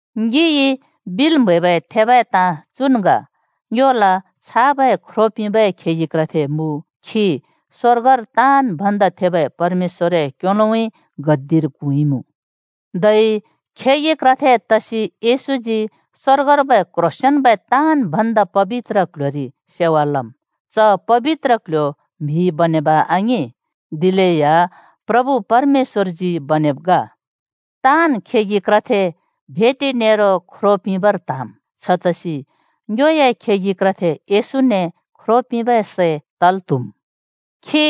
ङिइ बिल् म्हैबै थेबै ताँ चुन् ग: ङ्योला छाबै ख्रो पिंबै खेगि क्रथे मुँ, खी स्‍वर्गर ताँन् भन्दा थेबै परमेश्‍वरए क्‍योलोउँइँ (कयोउँइँ) गद्दिर क्हुँइमुँ। धै खेगि क्रथे तसि येशूजी स्‍वर्गर्बै क्ह्रोंसेंन्बै ताँन् भन्दा पबित्र क्ल्ह्‍योरि सेवा लम्। च पबित्र क्ल्ह्‍यो म्‍हिइ बनेब आङिं, दिलेया प्रभु परमेश्‍वरजी बनेब ग। ताँन् खेगि क्रथे भेटि नेरो ख्रो पिंबर त्‍हाँम्। छतसि ङ्योए खेगि क्रथे येशूने ख्रो पिंबै सै तल् त्हुम्। खी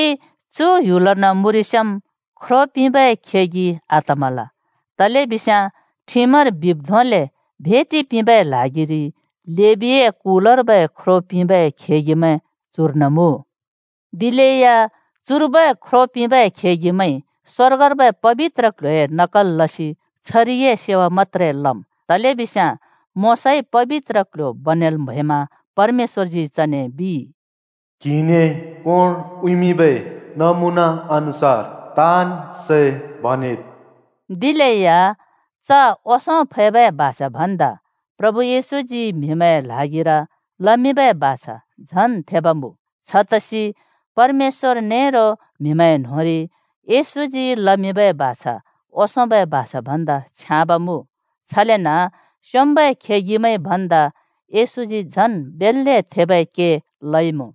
चु पृथ्‍बीर्न मुँरिस्याँम् ख्रो पिंबै खेगि आतमल, तलेबिस्याँ ठिमर बिब् धोंले भेटि पिंबै ल्हागिरि लेबीए कुलर्बै ख्रो पिंबै खेगिमैं चुर्न मुँ। दिलेया चुर्बै ख्रो पिंबै खेगिमैंइ स्‍वर्गर्बै पबित्र क्ल्ह्‍योए नकल लसि छरिए सेवा मत्‍त्रे लम्। तलेबिस्याँ मोशाइ पबित्र क्ल्ह्‍यो बनेल् म्हैमा परमेश्‍वरजी चने बिइ, “क्‍हिने कोंर उँइँमिंबै नमुना अनुसार ताँन् सै बनेद्।” दिलेया च ओंसों फैबै बाछा भन्दा प्रभु येशूजी म्‍हिमैंए ल्हागिर लमिंबै बाछा झन् थेब मुँ। छतसि परमेश्‍वर नेरो म्‍हिमैं न्होंरि येशूजी लमिंबै बाछा ओंसोंबै बाछा भन्दा छ्याँब मुँ। छलेन स्‍योंम्‍बै खेगिमैंइ भन्दा येशूजी झन् बेल्‍ले थेबै के लइमुँ।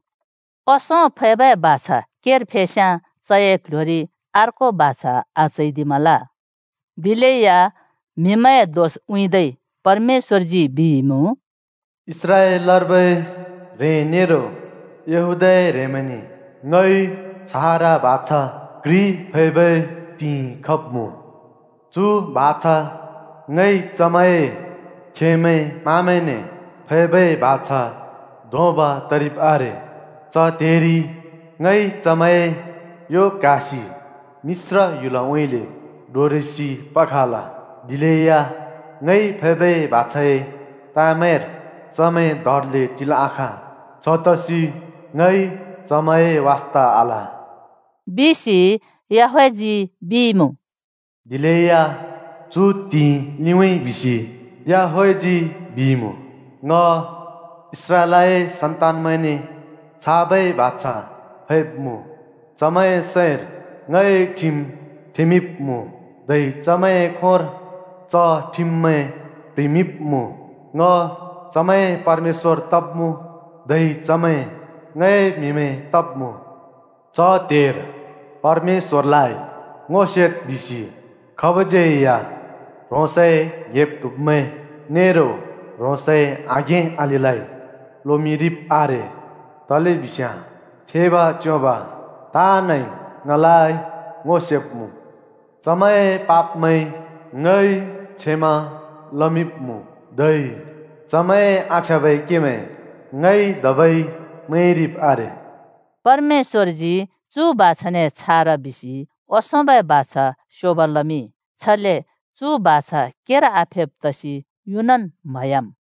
ओंसों फैबै बाछा केर फेस्याँ चए क्ल्ह्‍योरि अर्को बाछा आचैदिमल। दिलेया म्‍हिमैंए दोष उँइँदै परमेश्‍वरजी बिइमुँ, “इस्राएलर्बै ह्रें नेरो यहूदाए ह्रेंमैंने ङइ छारा बाछा घ्रि फैबै त्हिंइ खब्मुँ। चु बाछा ङइ चमैंए खेमैं-माँमैंने फैबै बाछा धोंब तरिब् आरे। च त्हेरि ङइ चमैंए यो क्‍हासि मिश्र ह्‍युलउँइँले डोरेसि पखल। दिलेया ङइ फैबै बाछाए ताँमैंर चमैं दरले टिल् आखाँ। छतसि ङइ चमैंए वास्‍ता आल,” बिसि याहवहजी बिइमुँ। “दिलेया चु त्‍हिंइ लिउँइँ, बिसि याहवहजी बिइमुँ। ङ इस्राएलए सन्तानमैंने छाबै बाछा फैब्‍मुँ: चमैंए सैंर ङए ठिम थेंमिंब्‍मुँ, धै चमैंए खोंर च ठिममैं प्‍ह्रिमिंब्‍मुँ। ङ चमैंए परमेश्‍वर तब्‍मुँ, धै चमैं ङए म्हिमैं तब्‍मुँ। च त्हेर ‘परमेश्‍वरलाइ ङो सेद्’ बिसि खाबज्‍यै या ह्रोंसए ङ्‍हेब्-ट्हुब्मैं नेरो ह्रोंसए आघें अलिलाइ लोमिंरिब् आरे, तलेबिस्याँ थेब च्‍योंब ताँनइ ङलाइ ङो सेब्‍मुँ। चमैंए पापमैं ङइ क्षमा लमिंब्‍मुँ, धै चमैंए आछ्याँबै केमैं ङइ धबै मैंरिब् आरे।” परमेश्‍वरजी चु बाछाने, “छारा,” बिसि ओंसोंबै बाछा स्योगो लामिंइ, छले चु बाछा केर आफेब् तसि युनन् म्‍हयाम्।